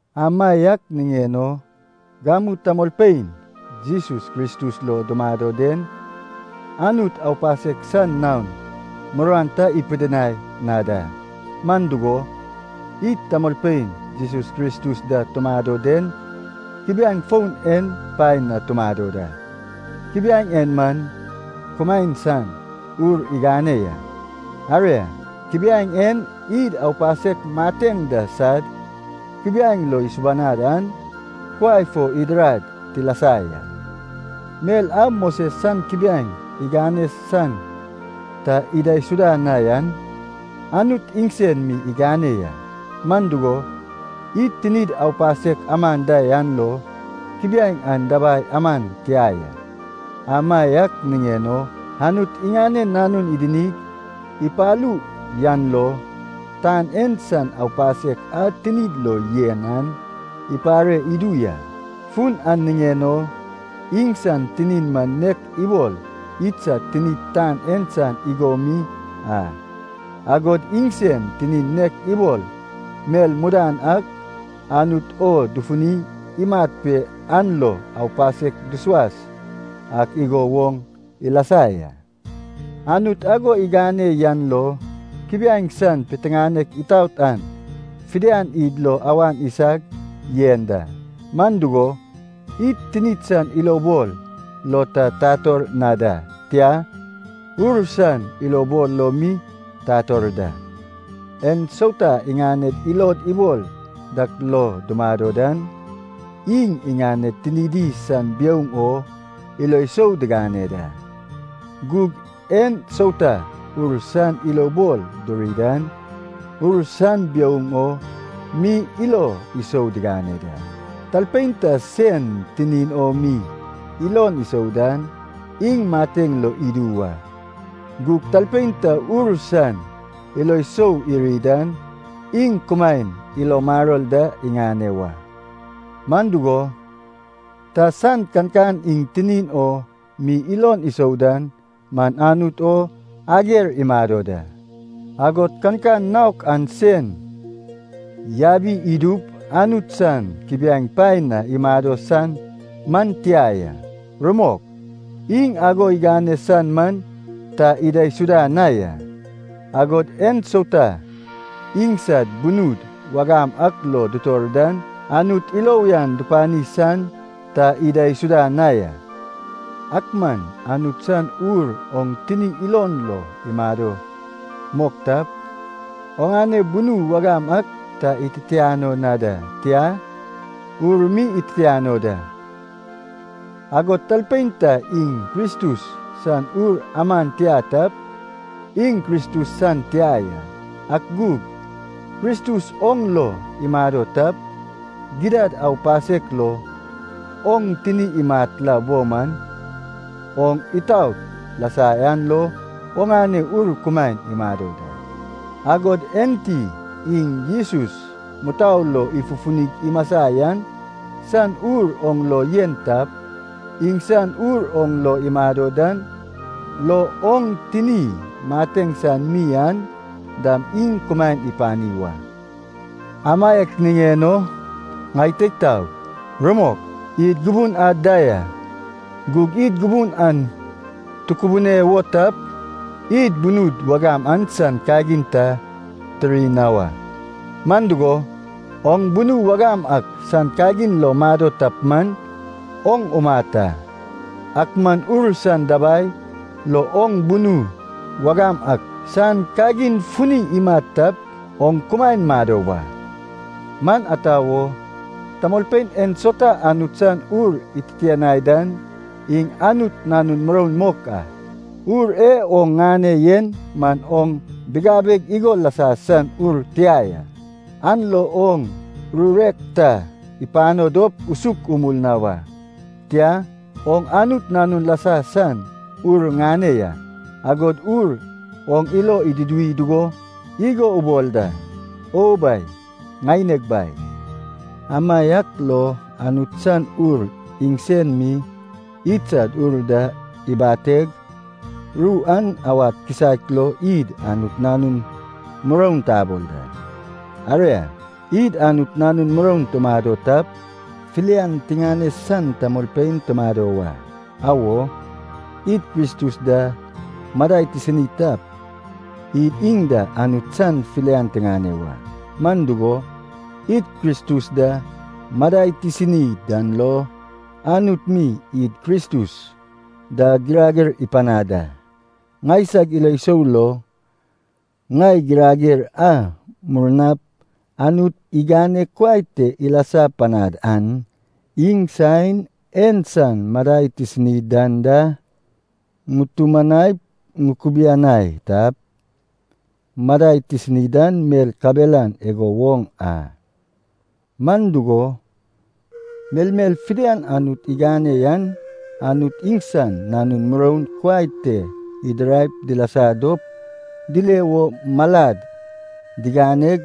Amaiak niŋen o gamu tamolpein Jesus Kristus lo dumado den, Anut aupasek san naon muruan ta ipidinai na da. Man dugo, id tamolpein Jesus Kristus da tumado den kubiaeŋ foun en paen na tumado da. Kubiaeŋ en man kumaen san Ur igane ya. Aria, kubiaeŋ en id aupasek mateŋ da sad kubiaeŋ lo isubanad an kuai fo idirad tilasa ya. Mel a Moses san kubiaeŋ igane san ta idaisuda na yan, Anut iŋsen mi igane ya. Man dugo, id tinid aupasek aman da yan lo kubiaeŋ an dabai aman tia ya. Amaiak niŋen o, Anut iŋanen Nanun idinig ipalu yan lo, tan en san aupasek a tinid lo yen an ipare idu ya. Fun an niŋen o, iŋsan tinin man nek ibol idsad tinid tan en san igo mi a, agod iŋsen tinin nek ibol mel mudan ak Anut o dufuni imat pe an lo aupasek dusuas ak igo woŋ ilasa ya. Anut ago igane yan lo kubiaeŋ san piteŋanek itaot an fidian id lo awan isag yen da. Man dugo, id tinid san ilobol lo ta tator na da, tia, Ur san ilobol lo mi tator da. En sauta iŋaned ilod ibol dak lo dumado dan, iŋ iŋaned tinidi san biouŋ o ilo sou digane da. Gug en sauta Ur san ilobol duri dan, Ur san biouŋ o mi ilo sou digane da. Talpein ta sen tinin o mi ilon isou dan, iŋ mateŋ lo idu wa. Gug talpein ta Ur san ilo sou iri dan, iŋ kumaen ilo maror da iŋane wa. Man dugo, ta san kankan iŋ tinin o mi ilon isou dan man Anut o ager imado da. Agod kankan naok an sen yabi idup Anut san kubiaeŋ paen na imado san man tia ya. Rumok, iŋ ago igane san man ta idaisuda na ya. Agod en sauta iŋsad bunud wagam ak lo dutor dan Anut ilo uyan dupani san ta idaisuda na ya. Ak man Anut san Ur oŋ tini ilon lo imado mok tap, oŋane bunu wagam ak ta ititiano na da, tia, Ur mi ititiano da. Agod talpein ta iŋ Kristus san Ur aman tia tap, iŋ Kristus san tia ya. Ak gug, Kristus oŋ lo imado tap, gidad aupasek lo oŋ tini imat la bo man, oŋ itaot lasa yan lo oŋane ur kumaen imado da. Agod enti iŋ Jesus mutou lo ifufunig imasa yan san Ur oŋ lo yen tap, iŋsan Ur oŋ lo imado dan lo oŋ tini mateŋ san mi an dam iŋ kumaen ipani wa. Amaiak niŋen o, ŋai teig taog, rumok, id gubun ad da ya. Gug id gubun an tukubune wo tap, id bunud wagam an san kagin ta tiri na wa. Man dugo, oŋ bunu wagam ak san kagin lo mado tap man, oŋ umat a. Ak man Ur san dabai lo oŋ bunu wagam ak san kagin funi imat tap, oŋ kumaen mado wa. Man ata wo, tamolpein ensauta Anut san Ur ititianai dan, iŋ Anut nanun muroun mok a. Ur e oŋ ŋane yen man oŋ bigabeg igo lasa san ur tia ya. An lo oŋ rurek ta ipano dop usuk umul na wa. Tia, oŋ Anut nanun lasa san Ur ŋane ya. Agod Ur oŋ ilo iduduwi dugo igo ubol da, “O Bai, ŋaineg Bai.” Amaiak lo Anut san Ur iŋsen mi idsad ur da ibateg, ru an awad kisaek lo id Anut nanun muroun tabol da. Aria, id Anut nanun muroun tumado tap, filian tiŋane san tamolpein tumado wa. Awo, id Kristus da madai tisini tap, id iŋ da Anut san filian tiŋane wa. Man dugo, id Kristus da madai tisini dan lo Anut mi id Kristus da girager ipanad a. Ŋaisag ilo sou lo, ŋai girager a murnap Anut igane kuai te ilasa panad an, iŋ saen en san madai tisini dan da, ŋutumanaip ŋukubianai tap, madai tisini dan mel kabelan igo woŋ a. Man dugo, melmel fidian Anut igane yan Anut iŋsan nanun muroun kuai te idiraip dilasa dop dile wo malad diganeg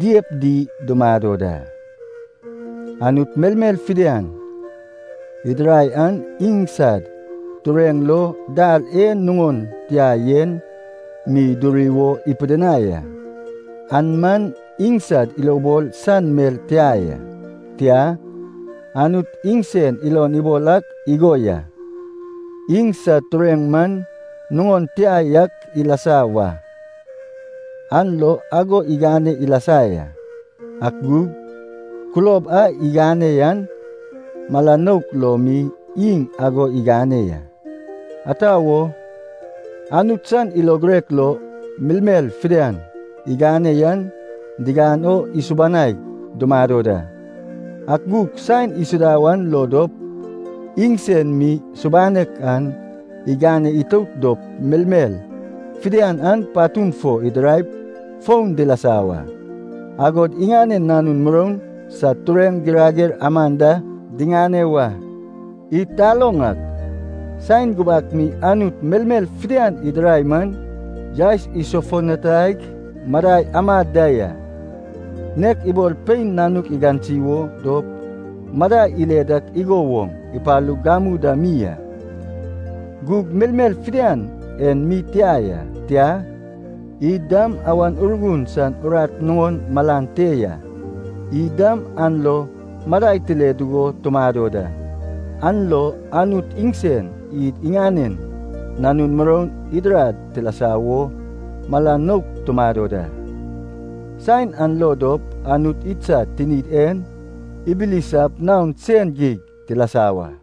diyep di dumado da. Anut melmel fidian idirai an iŋsad tureŋ lo dal e nuŋon tia yen mi duri wo ipidinai a. An man iŋsad ilobol san mel tia ya. Tia, Anut iŋsen ilon ibol ak igo ya, iŋsad tureŋ man nuŋon tia yak ilasa wa. An lo ago igane ilasa ya. Ak gug kulob a igane yan mala nouk lo mi iŋ ago igane ya. Ata wo, Anut san ilo girek lo, melmel fidian igane yan digan o isubanaig dumado da. Ak gug saen isuda wan lo dop, iŋsen mi subanek an igane itout dop melmel fidian an patun fo idiraip foun dilasa wa, agod iŋanen nanun muroun sad tureŋ girager aman da diŋane wa. Id taloŋ ak, saen gubak mi Anut melmel fidian idirai man yaes isofutanaig madai amad da ya. Nek ibol pein nanuk igansi wo dop madai ile dak igo woŋ ipalug gamu da mi a. Gug melmel fidian en mi tia ya, tia, id dam Awan Urgun san urat nuŋon malan te ya. Id dam an lo madai tile dugo tumado da. An lo Anut iŋsen id iŋanen nanun muroun idirad tilasa wo mala nouk tumado da. Saen an lo dop Anut idsad tinid en ibilisap naon sen geig tilasa wa.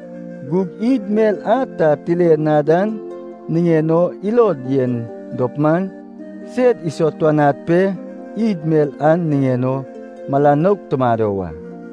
Gug id mel a ta tile na dan niŋen o ilod yen dop man, sed isatuanad pe, id mel an niŋen o mala nouk tumado wa.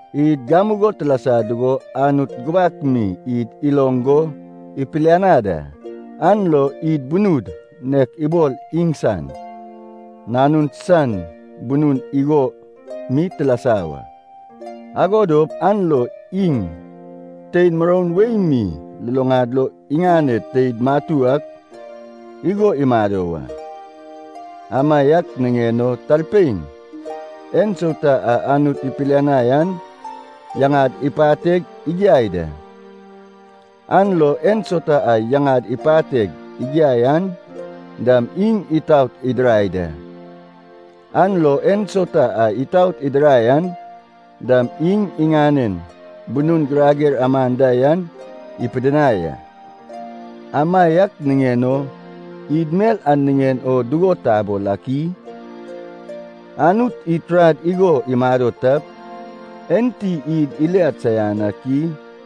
Id gamugo tilasa dugo Anut gubak mi id iloŋ go ipilianad a, an lo id bunud nek ibol iŋsan Nanun san bunun igo mi tilasa wa. Ago dop an lo iŋ tein muroun wei mi luluŋad lo iŋaned teid matu ak igo imado wa. Amaiak niŋen o talpein ensauta a Anut ipilianai an yaŋad ipateg igiai da. An lo ensauta a yaŋad ipateg igiai an dam iŋ itaot idirai da. An lo ensauta a itaot idirai an dam iŋ iŋanen bunun girager aman da yan ipidinai a. Amaiak niŋen o id mel an niŋen o dugo tabol ak i? Anut id turad igo imado tap, enti id iliad saian ak i?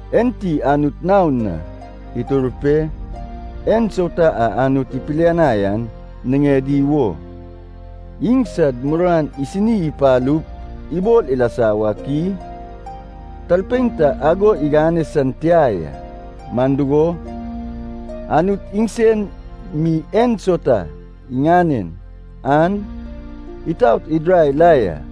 Enti Anut naon na itur pe, ensauta a Anut ipilianai an niŋedi wo, iŋsad muruan isini ipalup ibol ilasa wak i? Talpein ta ago igane san tia ya, man dugo, Anut iŋsen mi ensauta iŋanen an itaot idirai la ya.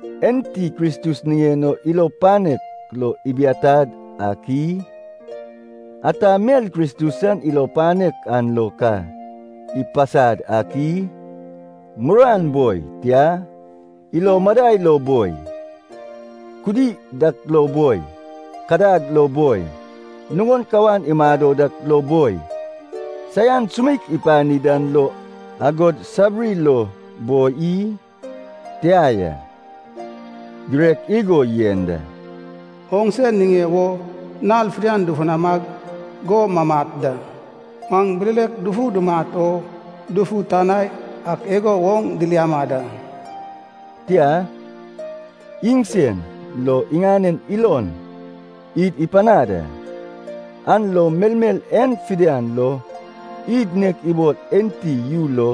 Enti Kristus iŋanen ilo panek lo ibiatad ak i? Ata mel Kristus san ilo panek an lo ka ipasad ak i? Muruan boi, tia, ilo madai lo boi, kudi dak lo boi, kadag lo boi, nuŋon kawan imado dak lo boi, saian sumeik ipani dan lo agod sabiri lo boi i? Tia ya. Girek igo yen da, “Oŋse niŋe wo nal fidian dufunamag go mamat da. Maŋ bilelek dufu dumat o dufutanai ak igo woŋ diliama da.” Tia, iŋsen lo iŋanen ilon id ipanad a, an lo melmel en fidian lo id nek ibol enti yu lo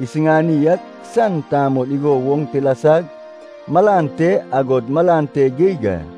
isiŋani ak san tamol igo woŋ tilasag malan te agod malan te geig a.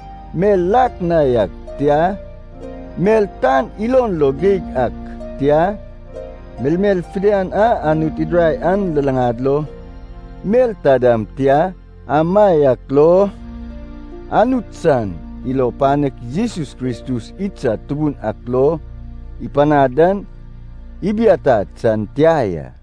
mel lak na yak tia, mel tan ilon lo geig ak tia, melmel fidian a Anut idirai an luluŋad lo mel ta dam tia, amaiak lo, Anut san ilo panek Jesus Kristus idsad Tubun ak lo, ipanad dan ibiatad san tia ya.